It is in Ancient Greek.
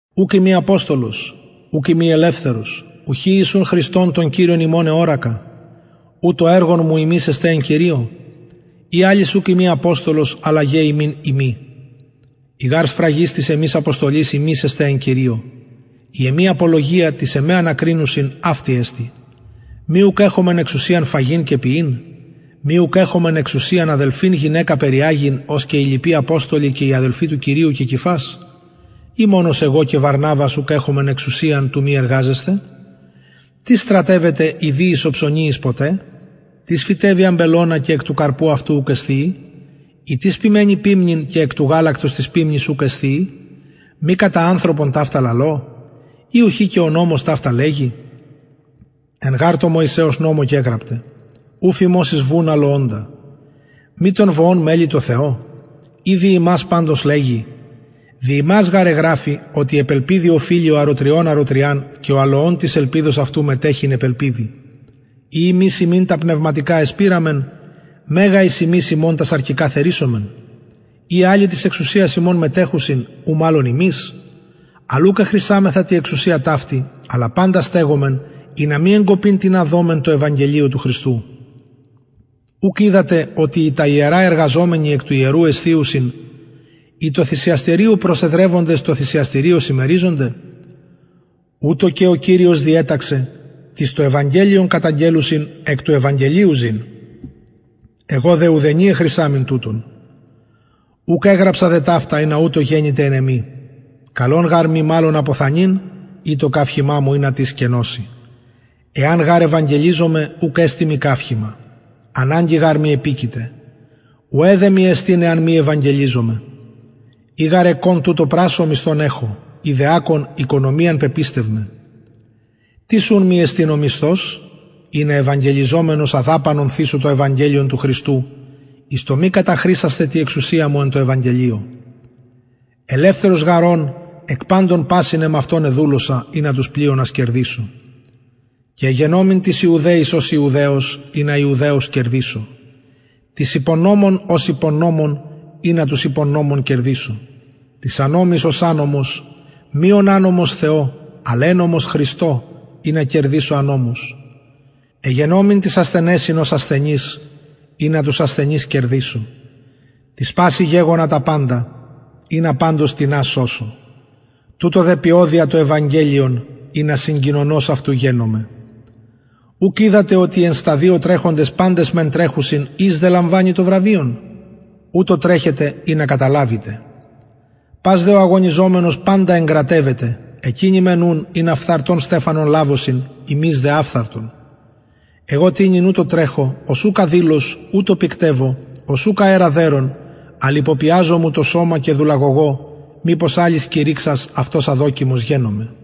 ουκ ειμι αποστολος ουκ ειμι ελευθερος ουχι ιησουν χριστον τον κυριον ημων εωρακα ου το εργον μου υμεις εστε εν κυριω ει αλλοις ουκ ειμι αποστολος αλλα γε υμιν ειμι η γαρ σφραγις της εμης αποστολης υμεις εστε εν κυριω η εμη απολογια τοις εμε ανακρινουσιν αυτη εστιν μη ουκ εχομεν εξουσιαν φαγειν και πιειν μη ουκ εχομεν εξουσιαν αδελφην γυναικα περιαγειν ως και οι λοιποι αποστολοι και οι αδελφοι του κυριου και κηφας η μονος εγω και βαρναβας ουκ εχομεν εξουσιαν του μη εργαζεσθαι τις στρατευεται ιδιοις οψωνιοις ποτε τις φυτευει αμπελωνα και εκ του καρπου αυτου ουκ εσθιει η τις ποιμαινει ποιμνην και εκ του γαλακτος της ποιμνης ουκ εσθιει μη κατα ανθρωπον ταυτα λαλω η ουχι και ο νομος ταυτα λεγει εν γαρ τω μωυσεως νομω γεγραπται ου φιμωσεις βουν αλοωντα μη των βοων μελει τω θεω η δι ημας παντως λεγει δι ημας γαρ εγραφη οτι επ ελπιδι οφειλει ο αροτριων αροτριαν και ο αλοων της ελπιδος αυτου μετεχειν επ ελπιδι ει ημεις υμιν τα πνευματικα εσπειραμεν μεγα ει ημεις υμων τα σαρκικα θερισομεν ει αλλοι της εξουσιας υμων μετεχουσιν ου μαλλον ημεις αλλ ουκ εχρησαμεθα τη εξουσια ταυτη αλλα παντα στεγομεν ινα μη εγκοπην τινα δωμεν τω ευαγγελιω του χριστου ουκ οιδατε οτι οι τα ιερα εργαζομενοι εκ του ιερου εσθιουσιν οι τω θυσιαστηριω προσεδρευοντες τω θυσιαστηριω συμμεριζονται ουτως και ο κυριος διεταξεν τοις το ευαγγελιον καταγγελλουσιν εκ του ευαγγελιου ζην εγω δε ουδενι εχρησαμην τουτων ουκ εγραψα δε ταυτα ινα ουτως γενηται εν εμοι καλον γαρ μοι μαλλον αποθανειν η το καυχημα μου ινα τις κενωση εαν γαρ ευαγγελιζωμαι ουκ εστιν μοι καυχημα αναγκη γαρ μοι επικειται ουαι δε μοι εστιν εαν μη ευαγγελιζωμαι ει γαρ εκων τουτο πρασσω μισθον εχω ει δε ακων οικονομιαν πεπιστευμαι τις ουν μοι εστιν ο μισθος ινα ευαγγελιζομενος αδαπανον θησω το ευαγγελιον του χριστου εις το μη καταχρησασθαι τη εξουσια μου εν τω ευαγγελιω ελευθερος γαρ ων εκ παντων πασιν εμαυτον εδουλωσα ινα τους πλειονας κερδησω και εγενομην τοις ιουδαιοις ως ιουδαιος ινα ιουδαιους κερδησω τοις υπο νομον ως υπο νομον ινα τους υπο νομον κερδησω τοις ανομοις ως ανομος μη ων ανομος θεω αλλ εννομος χριστω ινα κερδησω ανομους εγενομην τοις ασθενεσιν ως ασθενης ινα τους ασθενεις κερδησω τοις πασιν γεγονα τα παντα ινα παντως τινας σωσω τουτο δε ποιω δια το ευαγγελιον ινα συγκοινωνος αυτου γενωμαι ουκ οιδατε οτι οι εν σταδιω τρεχοντες παντες μεν τρεχουσιν εις δε λαμβανει το βραβειον ουτως τρεχετε ινα καταλαβητε πας δε ο αγωνιζομενος παντα εγκρατευεται εκεινοι μεν ουν ινα φθαρτον στεφανον λαβωσιν ημεις δε αφθαρτον εγω τοινυν ουτως τρεχω ως ουκ αδηλως ουτως πυκτευω ως ουκ αερα δερων αλλ υπωπιαζω μου το σωμα και δουλαγωγω μηπως αλλοις κηρυξας αυτος αδοκιμος γενωμαι